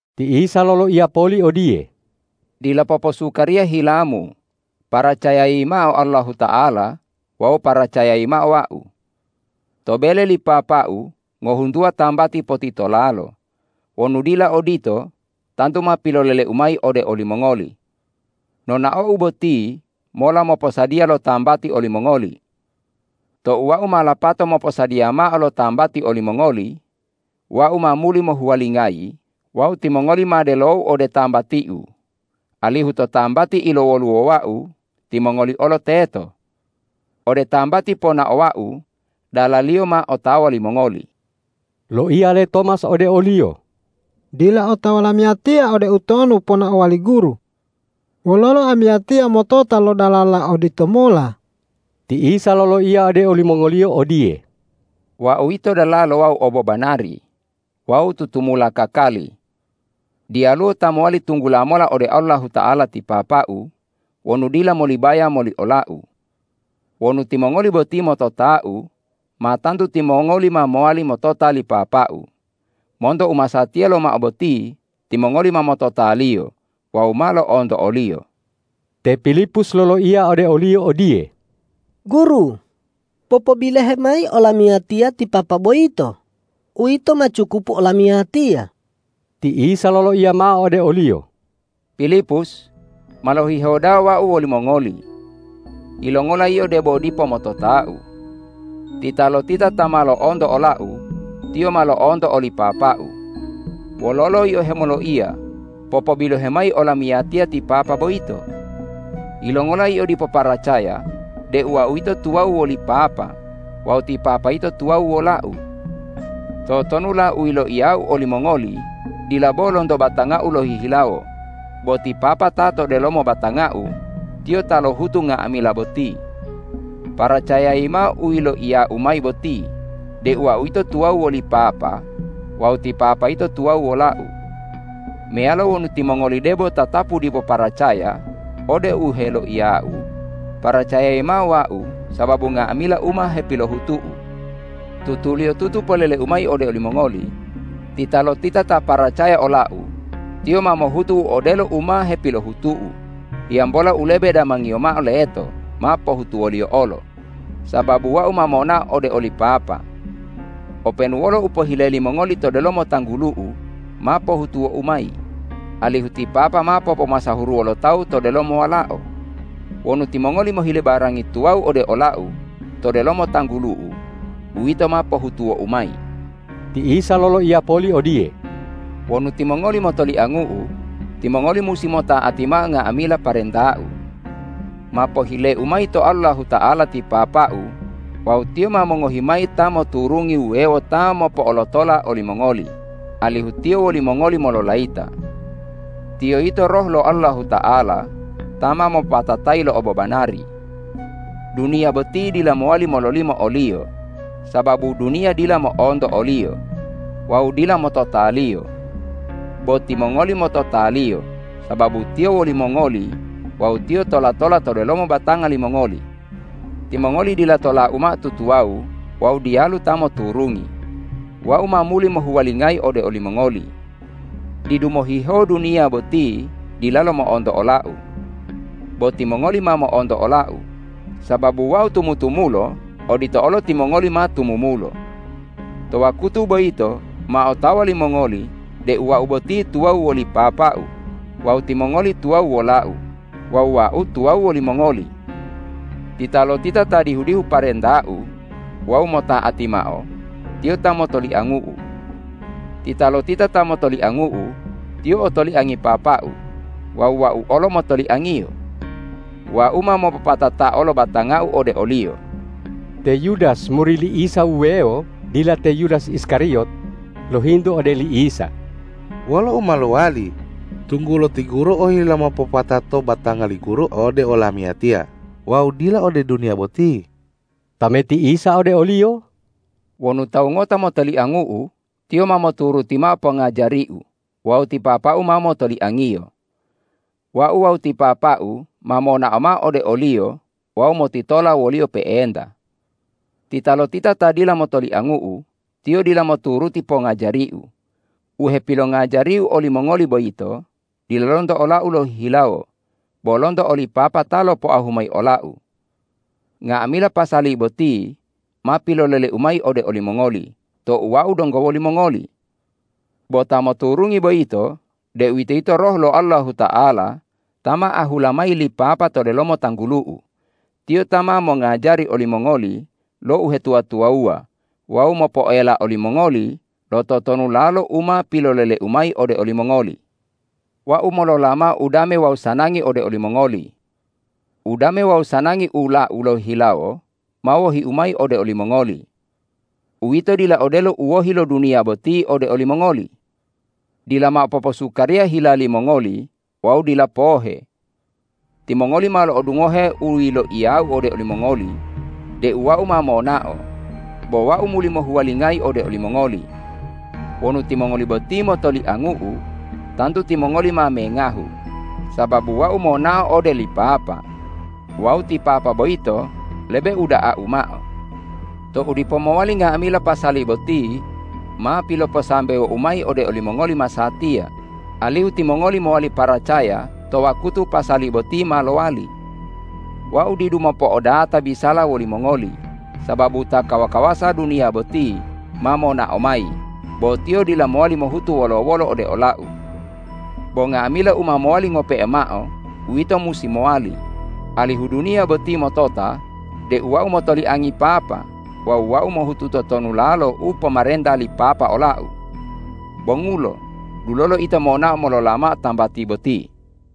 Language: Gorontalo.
Ti Isa loloiya poli odiye,”Dila poposukariya hilamu, paracayayi mao Allahuta'ala wawu paracayayi mao Wau. To bele li Papa-U ngohuntuwa tambati potitolalo. Wonu dila odito, tantu ma pilolele-U mayi ode olimongoli. Nonao-U boti mola moposadiya lo tambati olimongoli. Tou Wau ma lapato moposadiya mao lo tambati olimongoli, Wau ma muli mohuwalingayi wawu timongoli ma delo-U ode tambati-U, alihu to tambati ilowoluwowa-U, timongoli olo teto. Ode tambati ponaowa-U, dalaliyo ma otawa limongoli.” Loiya le Tomas ode o-Liyo,”Dila otawa lamiyatiya ode utonu ponaowa li Guru. Wololo amiyatiya motota lo dalala oditomola?” Ti Isa loloiya ode olimongoliyo odiye,”Wau yito dalalo wawu obobanari wawu tutumula kakali. Diyaluwo ta mowali tunggula mola ode Allahuta'ala ti Papa-U wonu dila molibaya moli ola-U. Wonu timongoli boti motota-U, ma tantu timongoli ma mowali motota li Papa-U; monto u masatiya lomao boti, timongoli ma motota-Liyo wawu ma lo'onto o-Liyo.” Te Pilipus loloiya ode o-Liyo odiye,”Guru, popobilohe mayi olamiyatiya ti Papa boyito, uwito ma cukupu olamiyatiya.” Ti Isa loloiya mao ode oliyo,”Pilipus, ma lohihewo da'a Wau wolimongoli. Yilongola yio debo dipo motota-U? Titalotita ta ma lo'onto ola-U, tiyo ma lo'onto oli Papa-U. Wololo yio hemoloiya, ’Popobilohe mayi olamiyatiya ti Papa boyito?’ Yilongola yio dipo paracaya deu Wau yito tuwawu woli Papa wawu ti Papa yito tuwawu wola-U? Totonula u yiloiya-U olimongoli dila bo lonto batanga-U lohihilawo, bo ti Papa ta to delomo batanga-U Tiyo ta lohutu nga'amila boti. Paracayayi mao u loiya-U mayi boti deu Wau yito tuwawu woli Papa wawu ti Papa yito tuwawu wola-U. Meyalo wonu timongoli debo tatapu dipo paracaya ode u heloiya-U, paracayayi mao Wau sababu nga'amila u ma hepilohutu-U. Tutuliyotutu polele-U mayi ode olimongoli: Titalotita ta paracaya ola-U, tiyo ma mohutu u odelo u ma hepilohutu-U, hiyambola u lebe damangiyo mao leto ma pohutuwoliyo olo, sababu Wau ma monao ode oli Papa. Openu wolo u pohile limongoli to delomo tanggulu-U, ma pohutuwo-U mayi, alihu ti Papa ma popomasahuruwo lo tawu to delomo Walao. Wonu timongoli mohile barangi tuwawu ode ola-U to delomo tanggulu-U, uwito ma pohutuwo-U mayi.” Ti Isa loloiya poli odiye,”Wonu timongoli motoliangu-U, timongoli musi mota'ati mao nga'amila parenta-U. Ma pohile-U mayi to Allahuta'ala ti Papa-U wawu Tiyo ma mongohi mayi Ta moturungi wuwewo ta mopo'olotola olimongoli, alihu Tiyo wolimongoli mololayita. Tiyo yito Roh lo Allahuta'ala ta ma mopopatatayi lo obobanari. Duniya boti dila mowali mololimo o-Liyo, sababu duniya dila mo'onto o-Liyo wawu dila motota-Liyo. Bo timongoli motota-Liyo sababu Tiyo wolimongoli wawu Tiyo tola-tola to delomo batanga limongoli. Timongoli dila tola-U mao tutuwawu wawu diyalu ta moturungi. Wau ma muli mohuwalingayi ode olimongoli. Didu mohihewo duniya boti dilalo mo'onto ola-U. Bo timongoli ma mo'onto ola-U. Sababu Wau tumutumulo, odito olo timongoli ma tumumulo. To wakutu boyito ma otawa limongoli deu Wau boti tuwawu woli Papa-U, wawu timongoli tuwawu wola-U wawu Wau tuwawu wolimongoli. Titalotita ta dihu-dihu parenta-U wawu mota'ati mao, tiyo ta motoliangu-U. Titalotita ta motoliangu-U, tiyo otoliangi Papa-U wawu Wau olo motoliangiyo. Wau ma mopopatatao lo batanga-U ode oliyo.” Te Yudas muri li Isa wuwewo dila te Yudas Iskariyot, lohintu ode li Isa,”Wolo u ma lowali, tunggulo ti Guru ohila mopopatato batanga li Guru ode olamiyatiya wawu dila ode duniya boti?” Tameti Isa ode oliyo,”Wonu tawu ngota motoliangu-U, tiyo ma moturuti mao pongajari-U wawu ti Papa-U ma motoliangiyo. Wau wawu ti Papa-U ma monao mao ode oliyo wawu motitola woliyo pe'enta. Titalotita ta dila motoliangu-U, tiyo dila moturuti pongajari-U. U hepilongajari-U olimongoli boyito dila lonto ola-U lohihilawo, bo lonto oli Papa ta lopoahu mayi ola-U. Nga'amila pasali boti ma pilolele-U mayi ode olimongoli tou Wau donggo wolimongoli. Bo Ta moturungi boyito, deuwitoyito Roh lo Allahuta'ala ta ma ahula mayi li Papa to delomo tanggulu-U, Tiyo ta ma mongajari olimongoli lo uhetuwa-tuwawuwa wawu mopoela olimongoli lo totonulalo u ma pilolele-U mayi ode olimongoli. Wau molola mao udame wawu sanangi ode olimongoli. Udame wawu sanangi ula-U lohihilawo ma wohi-U mayi ode olimongoli. Uwito dila odelo u wohi lo duniya boti ode olimongoli. Dila mao poposukariya hila limongoli wawu dila pohe. Timongoli ma lo'odungohe u yiloiya-U ode olimongoli deu Wau ma monao, bo Wau muli mohuwalingayi ode olimongoli. Wonu timongoli boti motoliangu-U, tantu timongoli ma mengahu sababu Wau monao ode li Papa. Wawu ti Papa boyito lebe uda'a-U mao. Tou dipo mowali nga'amila pasali boti, ma piloposambewo-U mayi ode olimongoli masatiya, alihu timongoli mowali paracaya to wakutu pasali boti ma lowali. Wau didu mopo'odata bisala wolimongoli, sababu ta kawa-kawasa duniya boti ma monao mayi, bo tiyo dila mowali mohutu wolo-wolo ode ola-U. Bo nga'amila u ma mowali ngope'e mao uwito musi mowali, alihu duniya boti motota deu Wau motoliangi Papa wawu Wau mohutu totonulalo u pomarenta li Papa ola-U. Bongulo, dulolo ito monao molola mao tambati boti.”